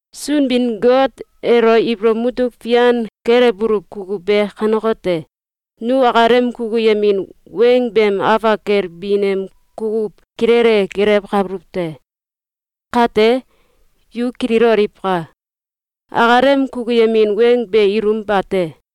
Sunbin-Got elo ibolow mutuk fian kelewbuluw kukuw be kanekote: Nu akalem kukuyemin weng beem afak kel bin em kukuw kilele gelewkabuluw te. Kate, yu kililoliwka! Akalem kukuyemin weng be ilum bate.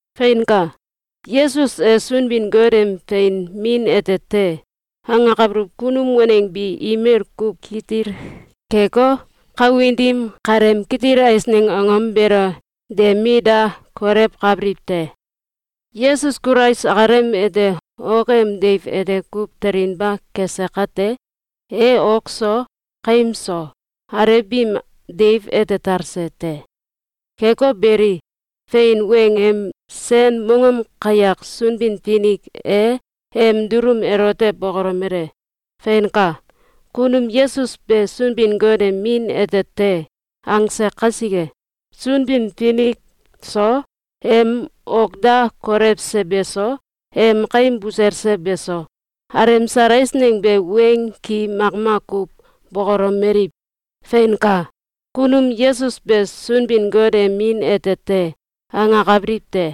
Feinka! “Yesus e Sunbin-Got em fein Min ete te!”, angakabiliw kunum waneng bi imel kuw kitil keko, kawin dim kaleem kitil eisneng angom beelo de mit da kolewkabiliw te. Yesus Kulais akalem ete ok em deiw ete kuw telinba kese kate, e ok so, kaim so, alew biim deiw ete talse te. Keko beli, fein weng em sen mongom kayak Sunbin-Finik e em dulum elote bokolomele: “Feinka! Kunum Yesus be Sunbin-Got em Min ete te!”, angse kasike, Sunbin-Finik so, em ok da kolewse beso, em kaim buselse beso, alemsal eisneng be weng ki makmak kuw bokolomeliw: “Feinka! Kunum Yesus be Sunbin-Got em Min ete te!”, angakabiliw te.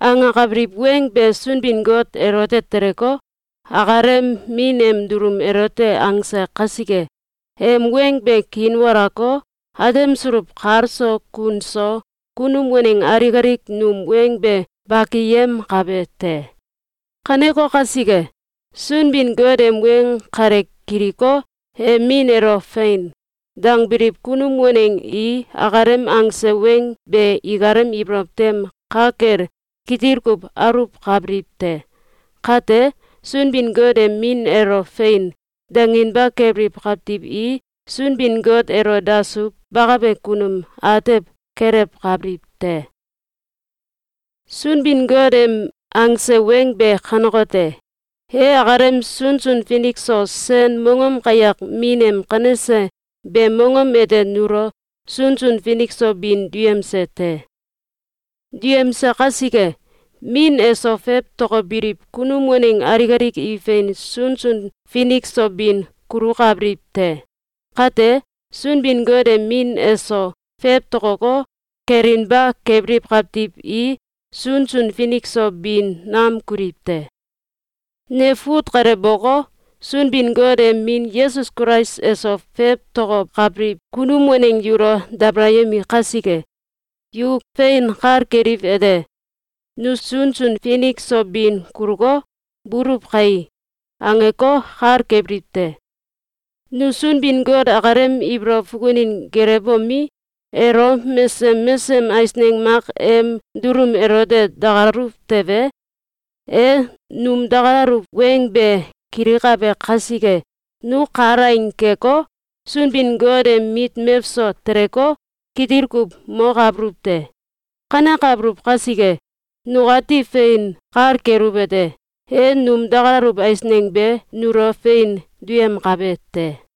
Angakabiliw weng be Sunbin-Got elote teleko, akalem Min em dulum elote angse kasike, em weng be kiinwalako, atemsuluw kal so kun so kunum waneng alik alik num weng be bakiyemkabe te. Kaneko kasike, Sunbin-Got em weng kale kiliko, em Min elo “Fein!”, dangbiliw kunum waneng i akalem angse weng be ikalem ibolow tem ka kel kitil kuw aluwkabiliw te. Kate, Sunbin-Got em Min elo “Fein!”, danginba kebiliw kawtiw i Sunbin-Got elo dasuw bakabe kunum atew kelewkabiliw te. Sunbin-Got em angse weng be kanekote: E akalem sunsun finik so sen mongom kayak Min em kanese beem mongom ete nulo sunsun finik so bin duyemse te. Duyemse kasike, Min eso fewtokobiliw kunum waneng alik alik i fein sunsun finik so bin kulukabiliw te. Kate, Sunbin-Got em Min eso fewtokoko, kelinba kebiliw kawtiw i sunsun finik so bin nam kuliw te. Ne fut kale boko, Sunbin-Got em Min Yesus Kulais eso fewtokokabiliw kunum waneng yulo dabalayemi kasike, yu fein kal keliwete: “Nu sunsun finik so bin kuluko, buluw kai”, angeko, kal kebiliw te. Nu Sunbin-Got akalem ibolow fukunin gelewbomi, elo mesesem mesesem eisneng mak em dulum elote dakalaluw tewe, e num dakalaluw weng be kilikabe kasike, nu kalaing keko, Sunbin-Got em mit mewso teleko, kitil kuw mokabuluw te. Kanekabuluw kasike, nukati fein kal keluwete: E num dakalaluw eisneng be nulo fein duyemkabe te.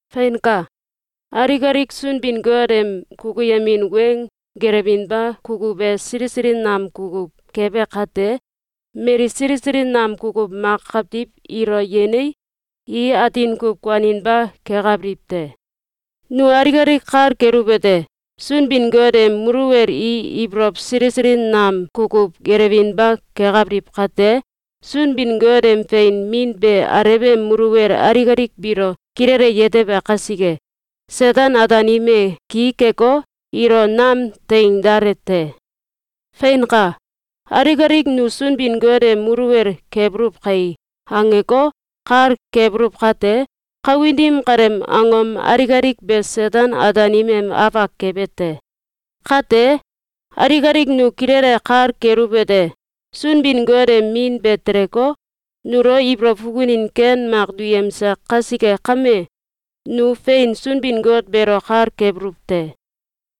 Feinka! Alik alik Sunbin-Got em kukuyemin weng gelewinba kukuw e sili sili nam kukuw kebe kate, mali sili sili nam kukuw mak kawtiw ilo yenei, i atin kuw kuaninba kekabiliw te. Nu alik alik kal keluwete: Sunbin-Got em muluwel i ibolow sili sili nam kukuw gelewinba kekabiliw kate, Sunbin-Got em fein Min be Alew em muluwel alik alik biilo kilele yetebe kasike, Seten-Ataanim e ki keko, ilo nam teing dale te. Feinka! “Alik alik nu Sunbin-Got em muluwel kebuluw kai!”, angeko, kal kebuluw kate, kawin dim kaleem angom alik alik be Seten-Ataanim em afak kebe te. Kate, alik alik nu kilele kal keluwete: Sunbin-Got em Min be teleko, nulo ibolow fukunin ken mak duyemse kasike kame, nu fein Sunbin-Got beelo kal kebuluw te.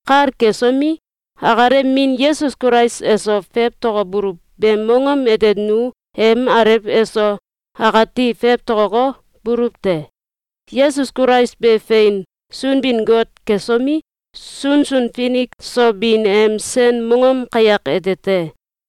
Kal kesomi, akalem Min Yesus Kulais eso fewtokobuluw beem mongom ete nu em Alew eso akati fewtokoko, buluw te. Yesus Kulais be fein Sunbin-Got kesomi, sunsun finik so bin em sen mongom kayak ete te.